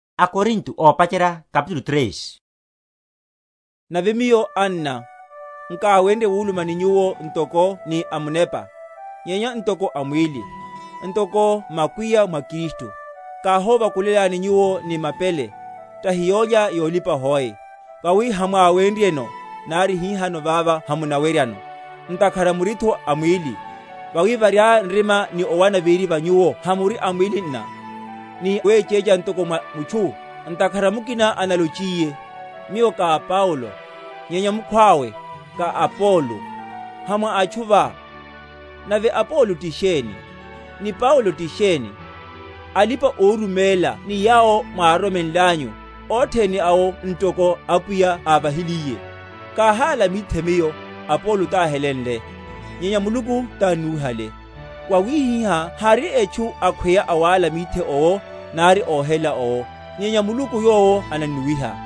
Sa omwalana véri va aKristu. Nave miyo, anna, nkáwenrye wuluma ni nyuwo ntoko ni amunepa, nyenya ntoko amwíli, ntoko makwiya mwa Kristu. Káhóvakulelani nyuwo ni mapele, tahi yólya yolipa hoe; vawi hamwáwenryeno; nari hihano vava hamunaweryano; ntakhara muritho a mwíli; vawi, variaya nrima ni owana véri va nyuwo hamuri a mwíli nna, ni wechécha ntoko niwa mutchu? Ntakhara mukina analochiye, Miyo ka a Paulo; nyenya mukhwawe, Ka a Apolo; ha mwa atchu va? Nave Apolo ti sheni, ni Paulo ti sheni? Alipa‐oruméla ni yawo mwároromenlanyu, othene awo ntoko Apwiya ávahiliye. Káhála mithe miyo, Apolo táhelenle; nyenya Muluku tánnuwihale. Wawihihá hari etchu akhweya awála mithe owo, nari óhelela owo; nyenya Muluku yowo anannuwiha.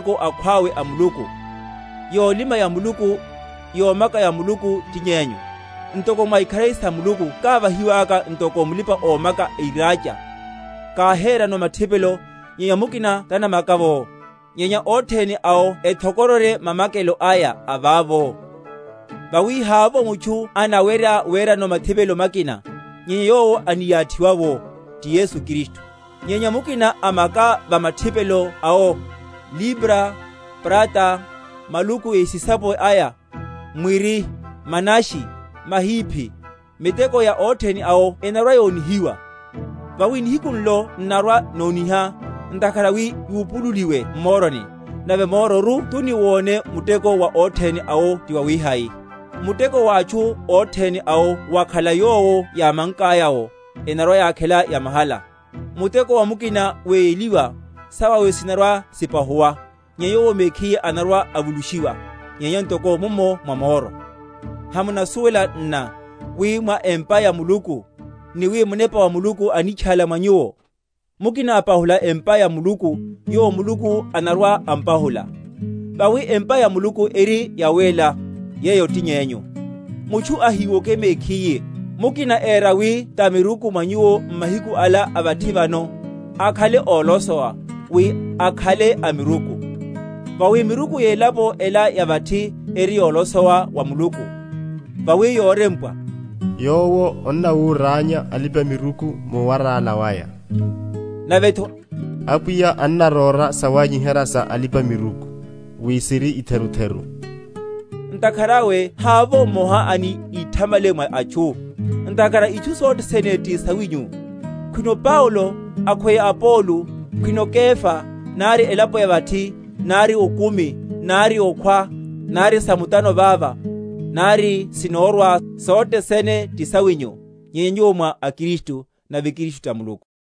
Vawi hiyo na alipa‐muteko akhwawe a Muluku; yolima ya Muluku, yomaka ya Muluku ti nyenyu. Ntoko mwa ikharari sa Muluku kávahiwaka, ntoko mulipa‐omaka airacha, káherano mathipelo, nyenya mukina tanamaka’vo. Nyenya othene awo ethokororye mamakelo aya a vavo. Vawi havovo mutchu anawerya werano mathipelo makina, nyenya yowo aniyathiwa’wo, ti Yesu Kristu. Nyenya mukina amaka va mathipelo awo, libra, prata, maluku ésisapo aya, mwiri, manashi, mahiphi, miteko ya othene awo enarwa‐yonihiwa; vawi nihiku nlo n’narwa‐noniha, ntakhara wi yupululiwe m’moroni; nave mororu tuni wone muteko wa othene awo tiwawihai. Muteko wa atchu othene awo wakhala yowo yámankaya’wo, enarwa‐yakhela yamahala. Muteko wa mukina weyeliwa, sawawe sinarwa‐sipahuwa; nyenya yowo mekhiye anarwa‐avulushiwa; nyenya ntoko mummo mwa moro. Hamunasuwela nna wi mwa empa ya Muluku, ni wi Munepa wa Muluku anitchála mwa nyuwo? Mukina apahula empa ya Muluku, yowo Muluku anarwa‐ampahula; vawi empa ya Muluku eri yawéla, yeyo ti nyenyu. Mutchu ahíwoke mekhiye; mukina éra wi tamiruku mwa nyuwo m’mahiku ala a vathi vano, akhale ólosowa, wi akhale amiruku. Vawi miruku yelapo ela ya vathi eri yolosowa wa Muluku. Vawi worempwa, Yowo annawúránya alipa‐miruku muwarála waya; navetho, Apwiya annarora sawanyiherya sa alipa‐miruku, wi siri etherutheru. Ntakhara awe havovo mmoha ani íthamale mwa atchu. Ntakhara itchu sothe sene ti sawinyu; khwino Paulo, akhweya Apolo, khwino Kefa, nari elapo ya vathi, nari okumi, nari okhwa, nari sa mutano vava, nari sinórwa; sothe sene ti sawinyu; nyenya nyuwo mwa a Kristu; nave Kristu ta Muluku.